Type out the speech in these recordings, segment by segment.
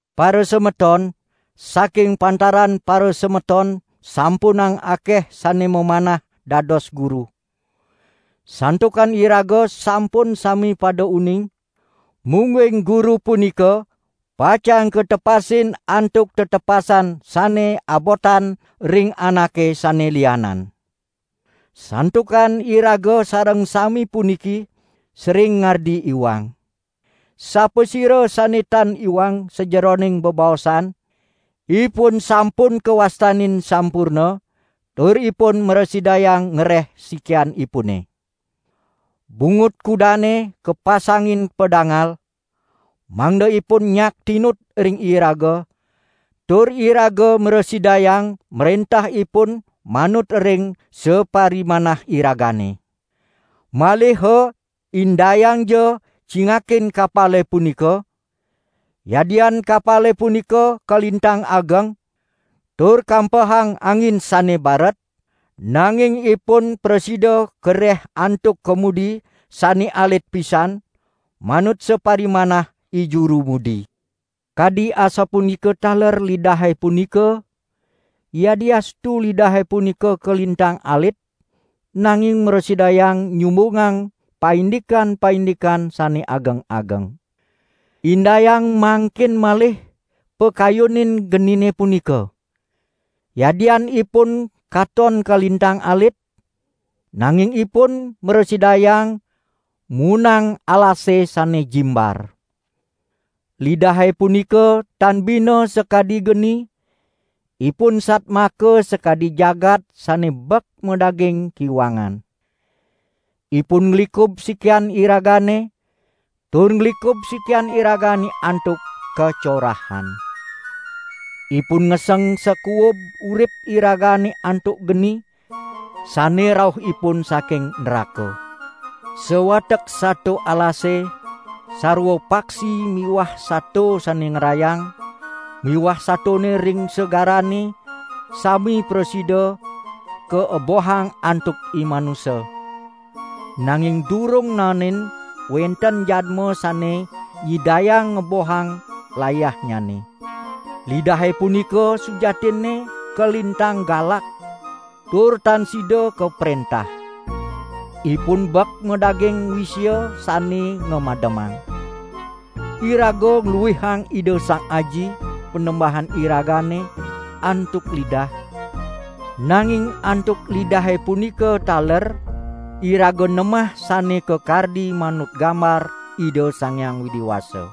Parasemeton, saking pantaran parasemeton sampunang akeh sane mamanah dados guru; santukan iraga sampun sami pada uning, mungguing guru punika pacang katepasin antuk tetepasan sane abotan ring anake sane lianan. Santukan iraga sareng sami puniki sering ngardi iwang. Sapasira sane tan iwang sajeroning bebaosan, ipun sampun kawastanin sampurna, tur ipun mrasidayang ngereh sikianipune. Bungut kudane kapasangin padangal, mangda ipun nyak tinut ring iraga, tur iraga mrasidayang mrentah ipun manut ring saparimanah iragane. Maliha indayangja cingakin kapale punika! Yadian kapale punika kalintang ageng, tur kampehang angin sane baret, nanging ipun prasida kareh antuk kemudi sane alit pisan manut saparimanah ijuru mudi. Kadi asapunika taler lidahe punika, yadiastu lidahe punika kalintang alit nanging mrasidayang nyumbungang paindikan-paindikan sane ageng-ageng. Indayang mangkin malih pakayunin genine punika. Yadian ipun katon kalintang alit, nanging ipun mrasidayang muunang alase sane jimbar. Lidahe punika tan bina sakadi geni, ipun satmaka sakadi jagat sane bek madaging kiwangan. Ipun nglikub sikian iragane, tur nglikub sikian iragane antuk kacorahan. Ipun ngeseng sakuub urip iragane antuk geni, sane rauhipun saking nraka. Sawatek sato alase, sarwa paksi miwah sato sane ngrayang miwah satone ring segarane sami prasida kaebohang antuk imanusa, nanging durung naenin wenten jadma sane nyidayang ngebohang layahnyane. Lidahe punika sujatinne kalintang galak tur tan sida kaprentah. Ipun bek madaging wisia sane ngamademang. Iraga ngluihang Ida Sang Aji, Panembahan iragane antuk lidah, nanging antuk lidahe punika taler iraga nemah sane kakardi manut gambar Ida Sang Hyang Widi Wasa.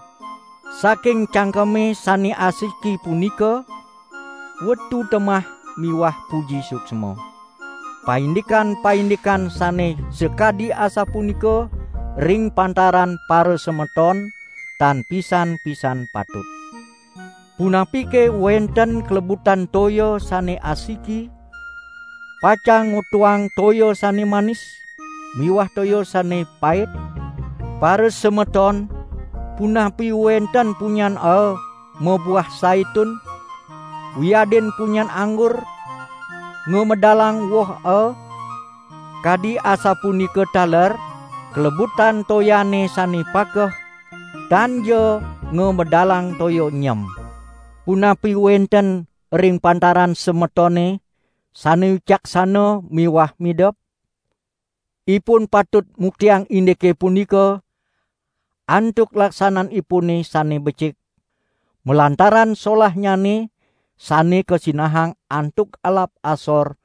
Saking cangkeme sane asiki punika wetu temah miwah puji suksma. Paindikan-paindikan sane sakadi asapunika ring pantaran parasemeton tan pisan-pisan patut. Punapike wenten klebutan toya sane asiki pacang ngwetuang toya sane manis miwah toya sane pait? Parasemeton, punapi wenten punyan aa mabuah saitun, wiadin punyan anggur ngamedalang woh aa? Kadi asapunika taler klebutan toyane sane pakeh, tanja ngamedalang toya nyem. Punapi wenten ring pantaran semetone sane wicaksana miwah midep? Ipun patut muktiang indike punika antuk laksananipune sane becik, malantaran solahnyane sane kasinahang antuk alap asor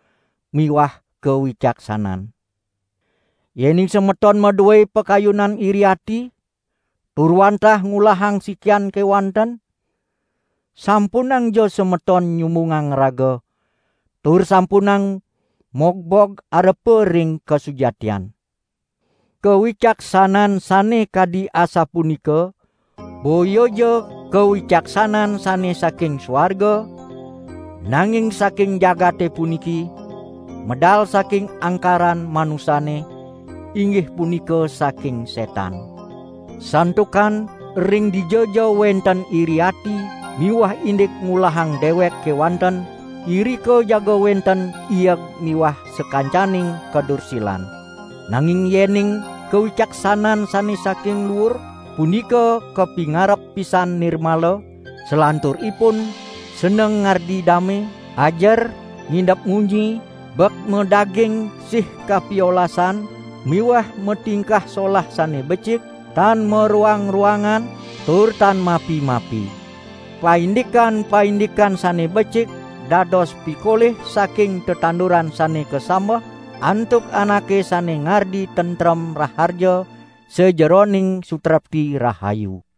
miwah kawicaksanan. Yening semeton madue pakayunan iri ati, tur wantah ngulahang sikian kewanten, sampunangja semeton nyumbungang raga, tur sampunang mogbog arepa ring kasujatian! Kawicaksanan sane kadi asapunika boyaja kawicaksanan sane saking suarga, nanging saking jagate puniki, medal saking angkaran manusane, inggih punika saking setan. Santukan ring dijaja wenten iri ati miwah indik ngulahang dewek kewanten, irika jaga wenten ieg miwah sakancaning kadursilan. Nanging yening kawicaksanan sane saking luur, punika kapingarep pisan nirmala, salanturipun seneng ngardi dame, ajer, ngidep munyi, bek madaging sih kapiolasan miwah matingkah solah sane becik, tan maroang-roangan, tur tan mapi-mapi. Paindikan-paindikan sane becik dados pikolih saking tetanduran sane kasambeh antuk anake sane ngardi tentrem raharja sajeroning sutrepti rahayu.